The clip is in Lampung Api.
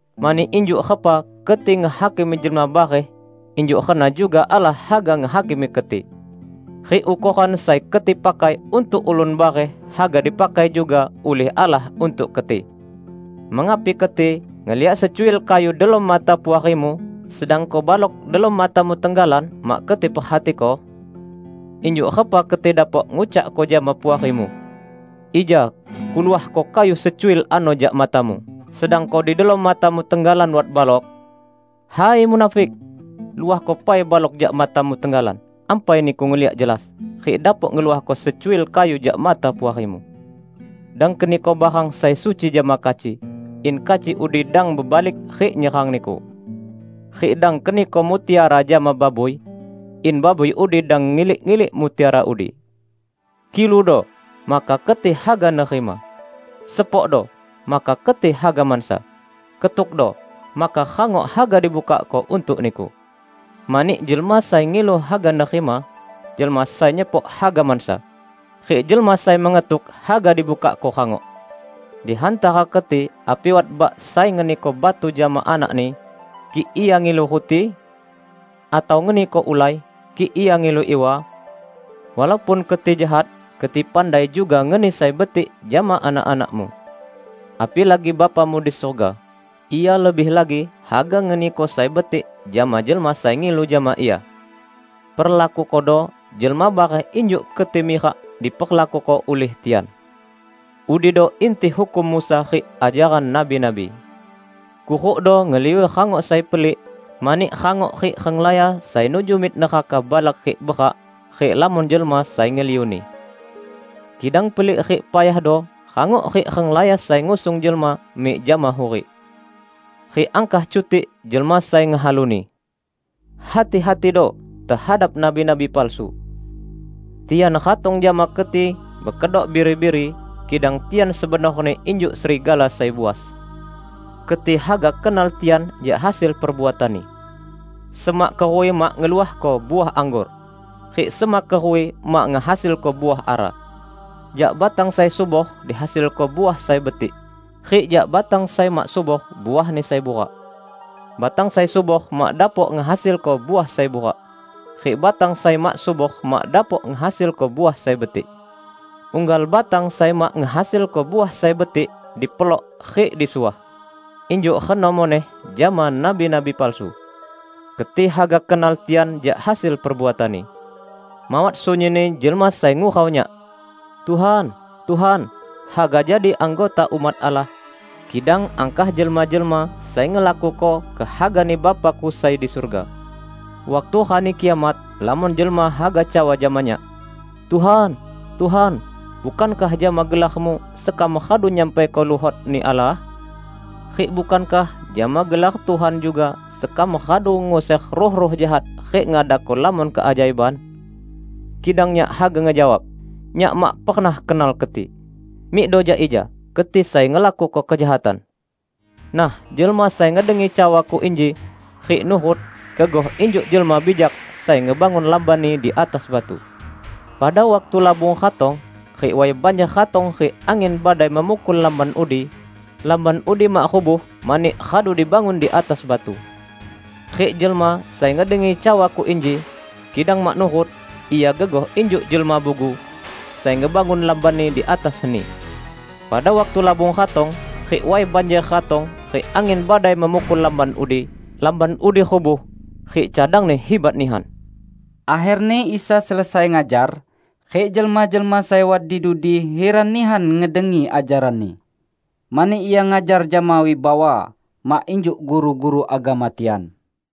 Mani injuk repa keti ngehakimi jelma bareh, injuk reno juga Allah haga ngehakimi keti. Rik ukoran sai keti pakai untuk ulun bareh, haga dipakai juga ulih Allah untuk keti. Mengapi keti ngeliak secuil kayu delom mata puarimu, sedangko balok delom matamu tenggalan mak keti perhatiko? Injuk repa keti dapok ngucakko jama puarimu, 'Ija kuluahko kayu secuil ano jak matamu,' sedangko di delom matamu tenggalan wat balok? Hai munafik! Luahko pai balok jak matamu tenggalan, ampai niku ngeliak jelas, rik dapok ngeluahko secuil kayu jak mata puarimu. Dang keniko barang sai suci jama kaci, in kaci udi dang bebalik rik nyerang niku. Rik dang keniko mutiara jama babui, in babui udi dang ngilik-ilik mutiara udi." "Kiludo, maka keti haga nerima. Sepokdo, maka keti haga mansa. Ketukdo, maka rangok haga dibukakko untuk niku. Mani jelma sai ngilu haga nerima; jelma sai nyepok haga mansa; rik jelma sai mengetuk, haga dibukakko rangok. Di hantara keti api wat bak sai ngeniko batu jama anakni, kik ia ngilu ruti? Atau ngeniko ulai, kik ia ngilu iwa? Walaupun keti jahat, keti pandai juga ngeni sai betik jama anak-anakmu. Apilagi Bapamu di surga! Ia lebih lagi haga ngeniko sai betik jama jelma sai ngilu jama Ia. Perlakukodo jelma bareh injuk keti mirak diperlakuko ulih tian. Udido inti hukum Musa rik ajaran nabi-nabi." "Kurukdo ngeliu rangok sai pelik, mani rangok rik renglaya sai nuju mik neraka balak rik berak, rik lamon jelma sai ngeliuni. Kidang pelik rik payahdo rangok rik renglaya sai ngusung jelma mik jama hurik. Rik angkah cutik jelma sai ngehaluni." "Hati-hatido tehadap nabi-nabi palsu. Tian ratong jama keti bekedok biri-biri, kidang tian sebenorni injuk serigala sai buas. Keti haga kenal tian jak hasil perbuatanni. Semak keruwi mak ngeluahko uah anggor, rik semak keruwi mak ngehasilko uah ara. Jak batang sai subor dihasilko uah sai betik, rik jak batang sai mak subor uahni sai burak. Batang sai subor mak dapok ngehasilko uah sai burak, rik batang sai mak subor mak dapok ngehasilko uah sai betik. Unggal batang sai mak ngehasilko uah sai betik, dipelok rik disuah. Injuk reno muneh jama nabi-nabi palsu. Keti haga kenal tian jak hasil perbuatanni." "Mawat sunyinni jelma sai ngurau Nyak, 'Tuhan, Tuhan,' haga jadi anggota umat Allah, kidang angkah jelma-jelma sai ngelakuko kehaga-Ni Bapa-Ku sai di surga. Waktu Rani Kiamat lamon jelma haga cawa jama Nyak, 'Tuhan, Tuhan, bukankah jama gelar-Mu sekam radu nyampaiko luhot-Ni Allah? Rik bukankah jama gelar Tuhan juga sekam radu nguser ruh-ruh jahat rik ngadako lamon keajaiban?' Kidang Nyak haga ngejawab, 'Nyak mak pernah kenal keti! Mikdo jak ija, keti sai ngelakuko kejahatan!' " "Nah, jelma sai ngedengi cawa-Ku inji, rik nurut, gegoh injuk jelma bijak sai ngebangun lambanni di atas batu. Pada waktu labung ratong, rik way banjer ratong rik angin badai memukul lamban udi, lamban udi mak rubuh mani radu dibangun di atas batu. Rik jelma sai ngedengi cawa-Ku inji, kidang mak nurut, ia gegoh injuk jelma bugu sai ngebangun lambanni di atas heni. Pada waktu labung ratong, rik way banjer ratong rik angin badai memukul lamban udi, lamban udi rubuh. Rik cadangni hibat nihan!" Akherni Isa selesai ngajar, rik jelma-jelma sai wat di dudi hiran nihan ngedengi ajaran-Ni. Mani Ia ngajar jama wibawa, mak injuk guru-guru agama tian.